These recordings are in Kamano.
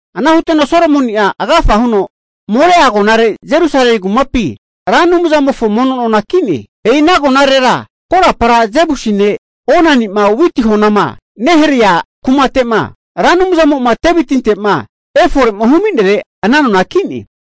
Ana huteno Solomoni'a agafa huno Moraia agonare Jerusalemi kumapi Ra Anumzamofo mono nona ki'ne. E'i ana agonarera korapara Jebusi ne' Onani'ma witi honama neharea kumate'ma, Ra Anumzamo'ma Devitinte'ma efore'ma hu'minere ana nona ki'ne.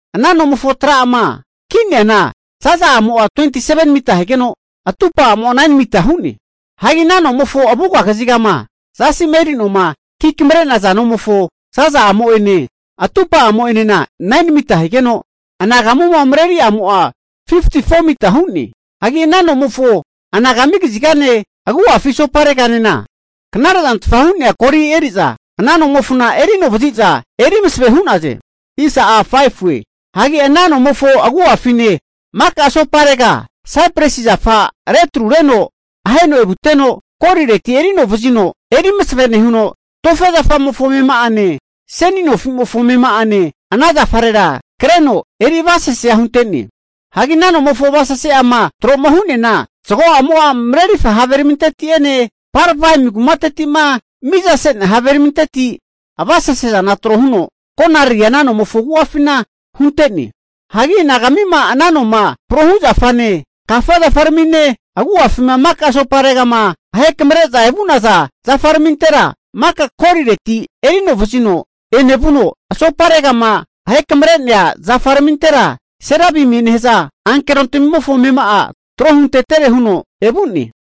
Ana nomofo tra'ama (foundation) ki'neana zaza'amo'a 27mita higeno, atupa'amo'a 9mita hu'ne. Hagi ana nomofona avuga kazigama zasi'ma eri noma ki kamare'naza nomofo zaza'amo'ene, atupa'amo'enena 9mita higeno, anagamuma mareri'amo'a 54mita hu'ne. Hagi ana nomofo anagami kazigane agu'afi asopareganena knare'zantfa hu'nea goli eri'za ana nomofona eri anovazi'za eri masave hu'naze. Hagi ana nomofo agu'afine maka asoparega saipresi zafa retrureno aheno evuteno, golireti eri anovazino eri masave nehuno, tofe zafamofo amema'ane, seni nofi'mofo amema'ane ana zafarera kreno eri avasesea hunte'ne. Hagi ana nomofo avasase'ama tro'ma hu'neana, zago'amo'a marerirfa haveraminteti'ene Parvaim kumateti'ma mizase'nea haveraminteti avasese zana tro huno konariri'a ana nomofo agu'afina hunte'ne. Hagi anagamima ana noma prohu zafane, kafa zafaramine, agu'afima maka asoparegama ahekamre'zama evu'naza zafaramintera maka golireti eri anovazino enevuno, asoparegama ahekamre'nea zafaramintera serabimie nehaza ankerontamimofo amema'a tro huntetere huno evu'ne.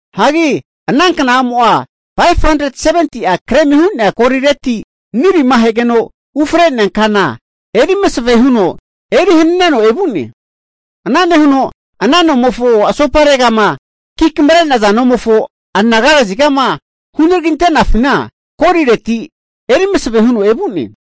Hagi kna'amo'a 570'a gremi hu'nea golireti, nilima ahegeno ufre'nea kana eri masave huno eri hananeno evu'ne. Ana nehuno ana nomofo asoparegama ki kamre'naza nomofo anaga kazigama hunaraginte'nafina, golireti eri masave huno evu'ne.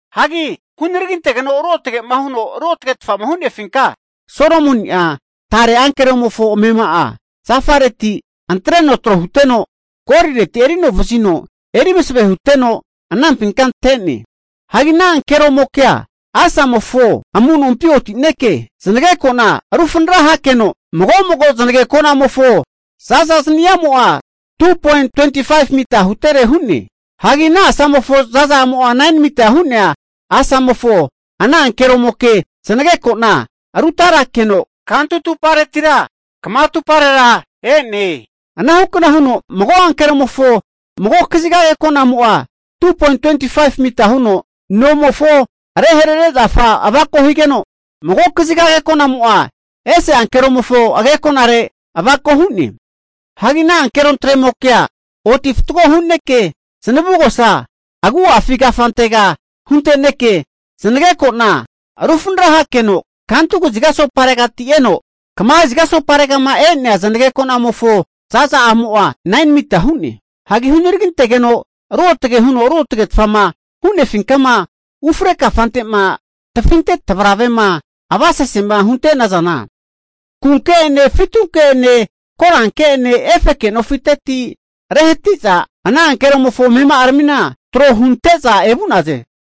Hagi hunaragintegeno ruotagema huno ruotagetfama hu'nefinka Solomoni'a tare ankeromofo amema'a zafareti antreno tro huteno, golireti eri anovazino eri masave huteno anampinka ante'ne. Hagi ana ankeromoke'a asamofo amunompi otineke zanageko'na rufranara hakeno'a mago'mago zanagekonamofo za'za zani'amo'a 2.25mita hutere hu'ne. Hagi ana asamofo zaza'amo'a 9mita hu'nea asagino ana ankeromokea zanageko'na rutarakeno kantu atuparetira kama atuparera e'ne. Anahukna huno mago ankeromofo mago kaziga ageko'namo'a 2.25mita huno nomofo areharare zafa avako higeno, mago kaziga agekonamo'a ese ankeromofo agekonare avako hu'ne. Hagi ana ankerontremokea oti fatgo huneke zanavugosa agu'afi kafantega hunteneke zanagekona rufanara hakeno kantu kaziga asoparegati eno, kama kaziga asoparegama e'nea, zanageko'namofo zaza'amo'a 9mita hu'ne. Hagi hunaragintegeno ruotage huno ruotagetfama hu'nefinkama ufre kafante'ma tafinte tavravere'ma avasesema hunte'nazana, kunke'ene fitunke'ene koranke'ene efeke nofiteti rehati'za, ana ankeromofo amema'aramina tro hunte'za evu'naze.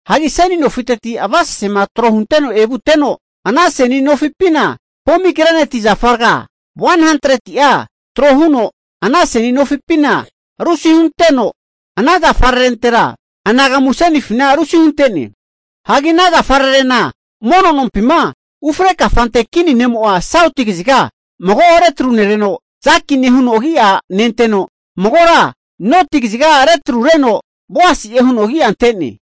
Hagi seni nofiteti avasesezana tro hunteno evuteno, ana seni nofipina pomigreneti zafa raga 100'a tro huno ana seni nofipina rusi huteno, ana zafararentera anagamu asenifina rusi hunte'ne. Hagi ana zafararena mono nompima ufre kafante kini ne'mo'a sauti kaziga mago retrunereno, Jakini'e huno agi'a nenteno, magora noti kaziga retrureno Boasi'e huno agi'a ante'ne.